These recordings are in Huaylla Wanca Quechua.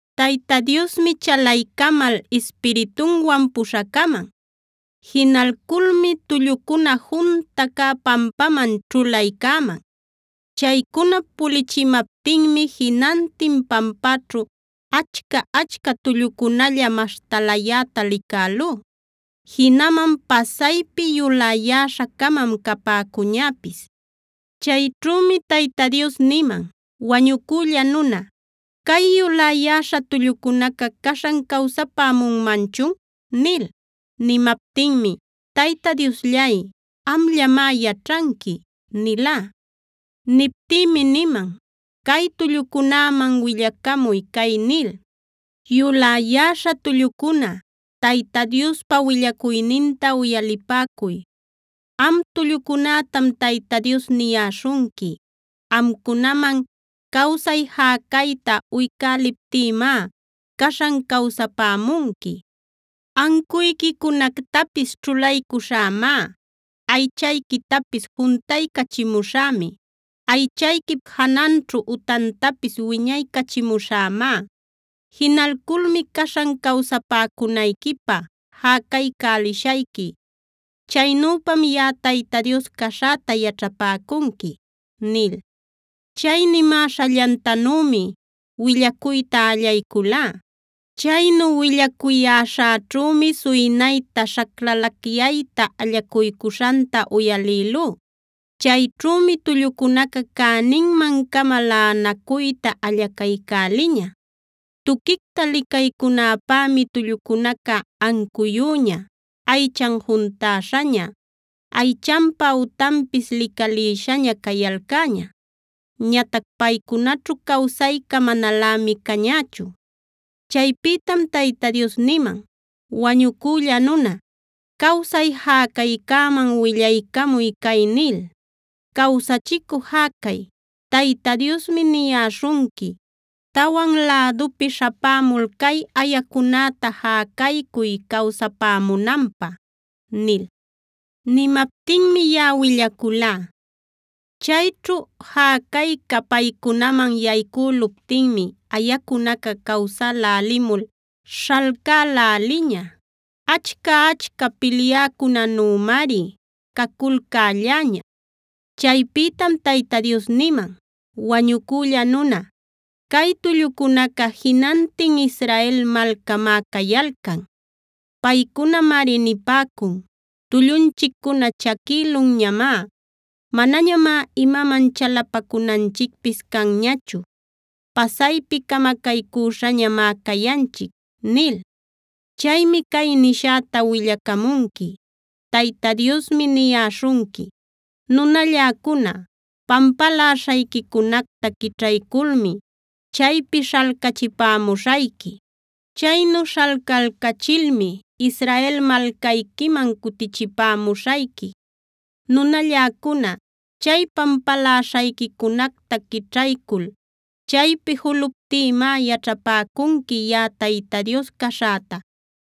Tayta Diosmi chalaycamal Ispiritunwan puśhacaman. Jinalculmi tullucuna junta cä pampaman ćhulaycäman. Chaycunap pulichimaptinmi jinantin pampäćhu achca-achca tullucunalla maśhtalayäta licälú. Jinaman pasaypi yuläyäśha-camam capäcuñäpis. Chayćhümi Tayta Dios niman: “Wañucülla nuna, ¿cay yuläyäśha tullucunaca caśhan cawsapämunmanchun?” nil. Nimaptinmi: “Tayta Diosllay, amllamá yaćhanqui” nilá. Niptïmi niman: “Cay tullucunäman willacamuy cay nil: ‘Yuläyäśha tullucuna, Tayta Diospa willacuyninta uyalipäcuy. Am tullucunätam Tayta Dios niyäśhunqui. Amcunaman cawsay jäcayta uycäliptïmá caśhan cawsapämunqui. Ancuyquicunactapis ćhulaycuśhämá. Aychayquitapis juntaycachimuśhämi; aychayquip jananćhu utantapis wiñaycachimuśhämá. Jinalculmi caśhan cawsapämunayquipä jäcaycälishayqui. Chaynüpam yaꞌa Tayta Dios caśhäta yaćhapäcunqui’” nil. Chay nimäśhallantanümi willacuyta allayculá. Chaynu willacuyäśhäćhümi suynayta, śhaclalacyayta allacuycuśhanta uyalïlú. Chayćhümi tullucunaca cäninman-cama laꞌanacuyta allacaycäliña. Tuquicta licaycunäpämi tullucunaca ancuyüña, aychan juntäśhaña, aychanpa utanpis licalïshaña cayalcäña. Ñatac paycunaćhu cawsayca manalämi cañächu. Chaypïtam Tayta Dios niman: “Wañucülla nuna, cawsay jäcaycäman willaycamuy cay nil: ‘Cawsachicü jäcay, Tayta Diosmi niyäśhunqui: Tawan lädupi śhapämul cay ayacunäta jäcaycuy cawsapämunanpä’” nil. Nimaptinmi yaꞌa willaculá. Chayćhu jäcayca paycunaman yaycüluptinmi ayacunaca cawsälälimul śhalcäläliña. Achca-achca pilyäcunanümari caculcälläña. Chaypïtam Tayta Dios niman: “Wañucülla nuna, cay tullucunaca jinantin Israel malcamá cayalcan. Paycunamari nipäcun: ‘Tullunchiccuna chaquïlunñamá; manañamá imaman chalapacunanchicpis canñachu. Pasaypi camacaycüśhañamá cayanchic’ nil. Chaymi cay nishäta willacamunqui: ‘Tayta Diosmi niyäśhunqui: Nunalläcuna, pampaläśhayquicunacta quićhayculmi chaypi śhalcachipämuśhayqui. Chaynu śhalcalcachilmi Israel malcayquiman cutichipämuśhayqui. Nunalläcuna, chay pampaläśhayquicunacta quićhaycul chaypi juluptïmá yaćhapäcunqui yaꞌa Tayta Dios caśhäta.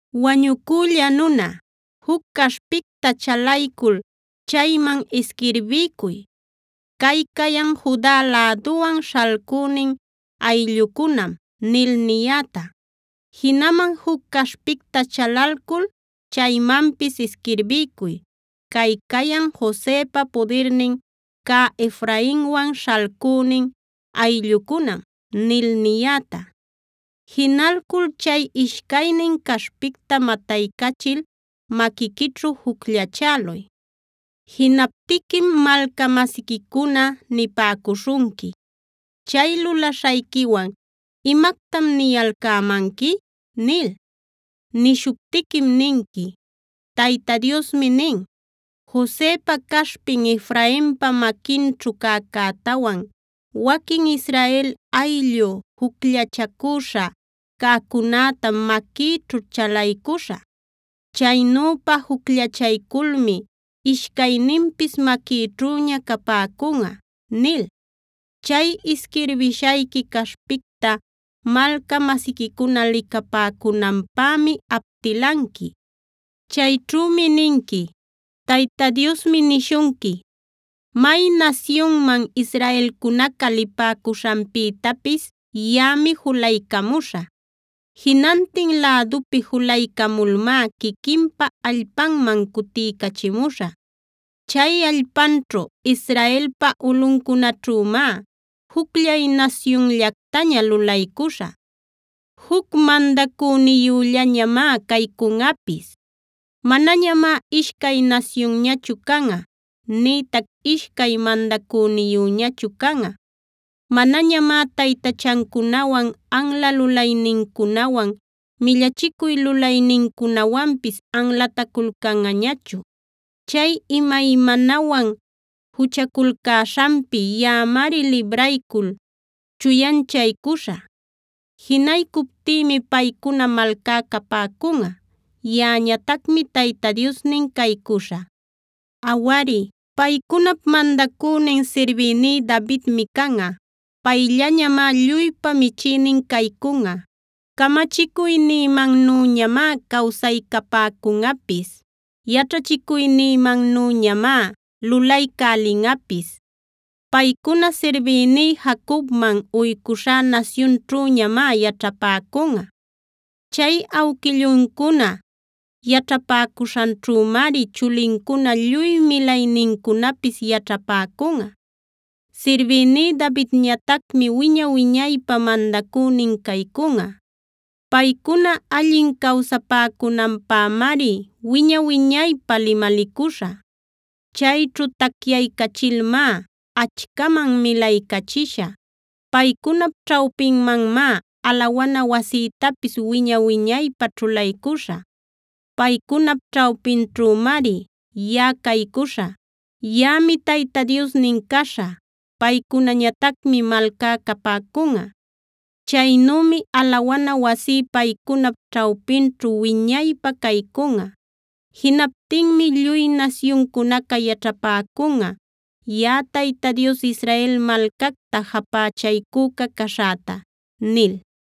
“Wañucülla nuna, juc caśhpicta chalaycul chayman isquirbiycuy ‘Cay cayan Juda läduwan śhalcünin ayllucunam’ nil niyäta. Jinaman juc caśhpicta chalalcul chaymanpis isquirbiycuy ‘Cay cayan Josepa pudirnin cä Efrainwan śhalcünin ayllucunam’ nil niyäta. Jinalcul chay ishcaynin caśhpicta mataycachil maquiquićhu jucllachäluy. Jinaptiquim malca-masiquicuna nipäcuśhunqui: ‘Chay lulaśhayquiwan ¿imactam niyalcämanqui?’ nil. Nishuptiquim ninqui: ‘Tayta Diosmi nin: Josepa caśhpin Efrainpa maquinćhu cäcätawan waquin Israel ayllu jucllachacüśha cäcunätam maquïćhu chalaycuśhä. Chaynüpa jucllachayculmi ishcayninpis maquïćhüña capäcunꞌa’ nil. Chay isquirbishayqui caśhpicta malca-masiquicuna licapäcunanpämi aptilanqui. Chayćhümi ninqui: ‘Tayta Diosmi nishunqui: May nasyunman israelcunaca lipäcuśhanpïtapis yaꞌami julaycamuśhä. Jinantin lädupi julaycamulmá quiquinpa allpanman cutiycachimuśhä. Chay allpanćhu, Israelpa ulꞌuncunaćhümá jucllay nasyunllactaña lulaycuśhä. Juc mandacüniyüllañamá caycunꞌapis. Manañamá ishcay nasyunñachu canꞌa, nïtac ishcay mandacüniyüñachu canꞌa. Manañamá taytachancunawan, anla lulaynincunawan, millachicuy lulaynincunawanpis anlataculcanꞌañachu. Chay imaymanawan juchaculcäśhanpi yaꞌamari libraycul chuyanchaycuśhä. Jinaycuptïmi paycuna malcá capäcunꞌa; yaꞌañatacmi Tayta Diosnin caycuśhä. “ ‘Awari, paycunap mandacünin sirbïní Davidmi canꞌa. Payllañamá lluypa michïnin caycunꞌa. Camachicuynïmannüñamá cawsaycapäcunꞌapis; yaćhachicuynïmannüñamá lulaycälinꞌapis. Paycuna sirbïní Jacobman uycuśhá nasyunćhüñamá yaćhapäcunꞌa. Chay awquilluncuna yaćhapäcuśhanćhümari chulincuna, lluy milaynincunapis yaćhapäcunꞌa. Sirbïní Davidñatacmi wiña-wiñaypä mandacünin caycunꞌa. Paycuna allin cawsapäcunanpämari wiña-wiñaypä limalicuśhä. Chayćhu tacyaycachilmá achcaman milaycachishä. Paycunap ćhawpinmanmá alawana wasïtapis wiña-wiñaypä ćhulaycuśhä. Paycunap ćhawpinćhümari yaꞌa caycuśhä. Yaꞌami Tayta Diosnin caśhä. Paycunañatacmi malcá capäcunꞌa. Chaynümi alawana wasí paycunap ćhawpinćhu wiñaypä caycunꞌa. Jinaptinmi lluy nasyuncunaca yaćhapäcunꞌa yaꞌa Tayta Dios Israel malcacta japächaycüca caśhäta’” nil.